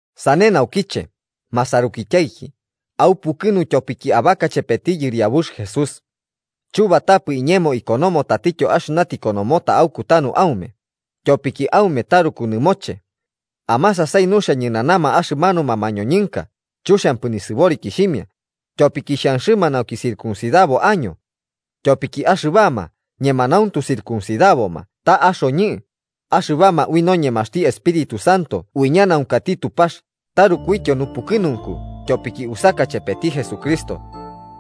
Sane naukiche, masarukityaiki, aupukɨnu tyopiki abaka chepeti Yɨriabux Jesús. Chubatapɨ iñemo ikonomo tatityo axɨna tikonomota aukutanu aume, tyopiki aume taruku nɨmoche. ¡Amasasai nuxia ñɨnanama axɨmanuma mañoñɨnka chuxiampɨ nisɨborikixhimia, tyopiki xhanxɨma nauki circuncidabo año! Tyopiki axɨbama ñemanauntu circuncidaboma ta axoñɨ, axɨbama ui noñemaxti Espíritu Santo uiñanaunkati Tupax tarukuityo nupukɨnunku tyopiki usaka chepeti Jesucristo.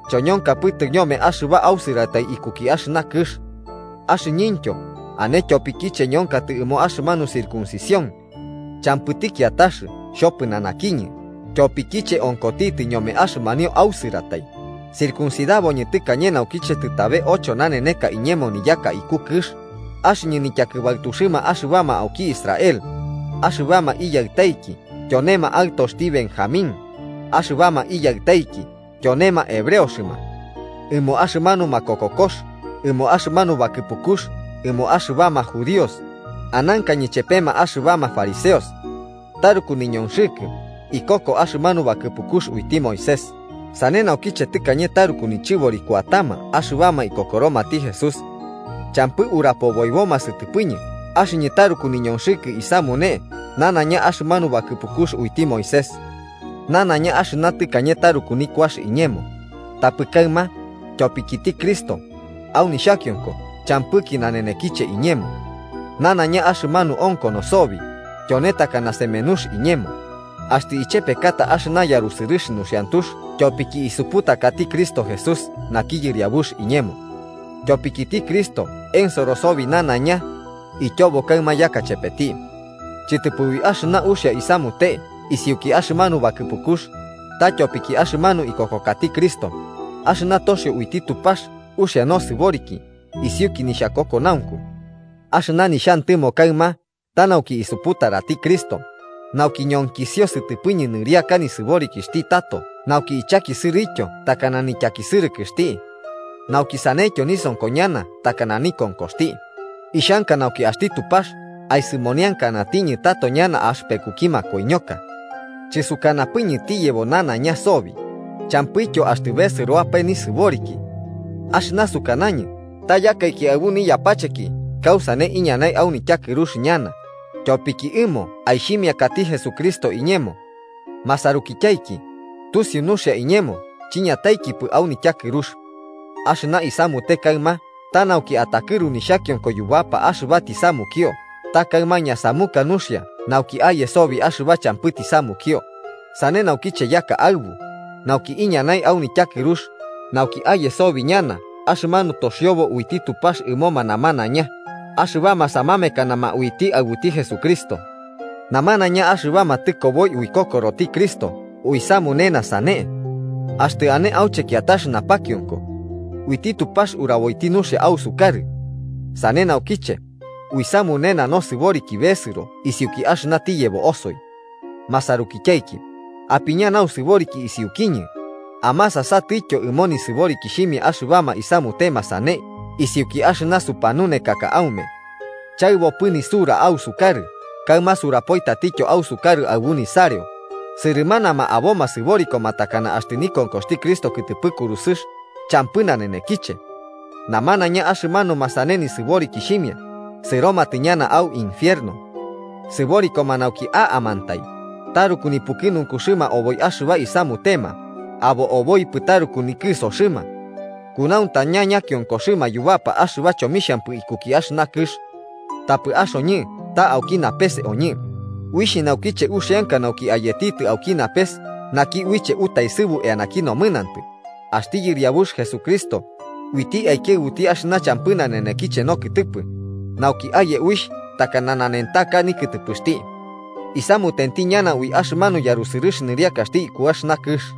Choñonkapɨtɨ ñome axɨba ausɨratai ikuki axɨna kɨx. Axɨñɨntyo ane tyopikiche ñonkatɨ ɨmo axɨmanu circuncisión. Champɨti kiatax xhopɨnanakiñɨ tyopikiche onkotitɨ ñome axɨmanio ausɨratai: circuncidaboñɨ tɨkañe naukiche tɨtabe ocho naneneka iñemo niyaka iku kɨx, axɨñɨ nityakɨbaɨtuxɨma axɨbama auki Israel, axɨbama iyaɨtaiki tyonema aɨtoxti Benjamín, axɨbama iyaɨtaiki tyonema hebreoxɨma. Ɨmo axɨmanu makokokox ɨmo axɨmanu bakɨpukux ɨmoma axɨbama judíox, anankañɨ chepema axɨbama fariseos. Taruku niñonxɨkɨ ikoko axɨmanu bakɨpukux uiti Moisés sane naukiche tɨkañe taruku nichɨbori kuatama axɨbama ikokoromati Jesús. ¡Champɨ urapoboiboma sɨtɨpɨñɨ axɨñɨ taruku niñonxɨkɨ isamune nanaiña axɨmanu bakɨpukux uiti Moisés! Nanaiña axɨna tɨkañe taruku nikuax iñemo, tapɨ kaɨma tyopikiti Cristo, au nixhakionko champɨki nanenekiche iñemo. Nanaiña axɨmanu onkono sobi, tyone takana semenux iñemo, axtɨ ichepekata axɨna yarusɨrɨx nuxiantux tyopiki isuputakati Cristo Jesús naki Yɨriabuxti iñemo. Tyopikiti Cristo ensoro sobi nanaiña, ityobo kaɨma yaka chepeti. Chɨtɨpɨ ui axɨna uxia isamute isiuki axɨmanu bakɨpukux, ta tyopiki axɨmanu ikokokati Cristo, axɨna toxio uiti Tupax uxia nosɨboriki isiuki nixhakokonaunku. Axɨna nixhantɨmo kaɨma ta nauki isuputarati Cristo, nauki ñonkisio sɨtɨpɨñɨ nɨriaka nisɨborikixhti tato nauki ichakisɨrɨtyo takana nityakisɨrɨkɨxti. Nauki saneityo nisonko ñana takana nikonkoxti, ixhanka nauki axti Tupax aisɨmoniankanatiñɨ tato ñana axɨpekuki makoiñoka. Chɨsukanapɨñɨ tiyebo nanaiña sobi, champɨityo axtɨ besɨroapae nisɨboriki. Axɨna sukanañɨ ta yakaiki aɨbu niyapacheki, kausane iñanai au nityakɨrux ñana, tyopiki ɨmo aixhimiakati Jesucristo iñemo. Masarukityaiki, tusiu nuxia iñemo chiñataikipɨ au nityakɨrux. Axɨna isamute kaɨma ta nauki atakɨru nixhakionko yubapa axɨba tisamukio ta kaɨma ñasamuka nuxia nauki aye sobi axɨba champɨ tisamukio, sane naukiche yaka aɨbu, nauki iñanai au nityakɨrux, nauki aye sobi ñana axɨmanu toxiobo uiti Tupax ɨmoma namanaiña axɨbama samamekanama uiti aɨbuti Jesucristo. Namanaiña axɨbama tɨkoboi uikokoroti Cristo uisamunena sane. Axtɨ ane auche kiatax napakionko. Uiti Tupax uraboiti nuxia ausukarɨ. Sane naukiche, uisamunena nosɨboriki besɨro isiuki axɨna tiyebo osoi. Masarukityaiki, apiña nausɨboriki isiukiñɨ amasasatɨtyo ɨmo nisɨborikixhimia axɨbama isamutema sane isiuki axɨna supanunekaka aume. Chaɨbopɨ nisura ausukarɨ, kaɨma surapoi tatityo ausukarɨ aɨbu nisareo, sɨrɨmanama aboma sɨborikoma takana axtɨ nikonkoxti Cristo kɨtɨpɨ kurusɨx champɨ nanenekiche. Namanaiña axɨmanuma sane nisɨborikixhimia sɨromatɨ ñana au infierno. Sɨborikoma nauki a'amantai, taruku nipukɨnunkuxɨma oboi axɨba isamutema, abo oboipɨ taruku nikɨsoxɨma. Kunauntaña ñakionkoxɨma yubapa axɨba chomixhampɨ ikuki axɨna kɨx. Tapɨ axoñɨ ta auki napes oñɨ, uixh naukiche uxianka nauki ayetitɨ auki napes naki uiche utaesɨbu eanaki nomɨnantɨ, axti Yɨriabux Jesucristo, uiti aikiaɨbuti axɨna champɨ nanenekiche nokɨtɨpɨ nauki aye uixh takana nanentaka nikɨtɨpɨxti. Isamutenti ñana ui axɨmanu yarusɨrɨx nɨriakaxti iku axɨna kɨx.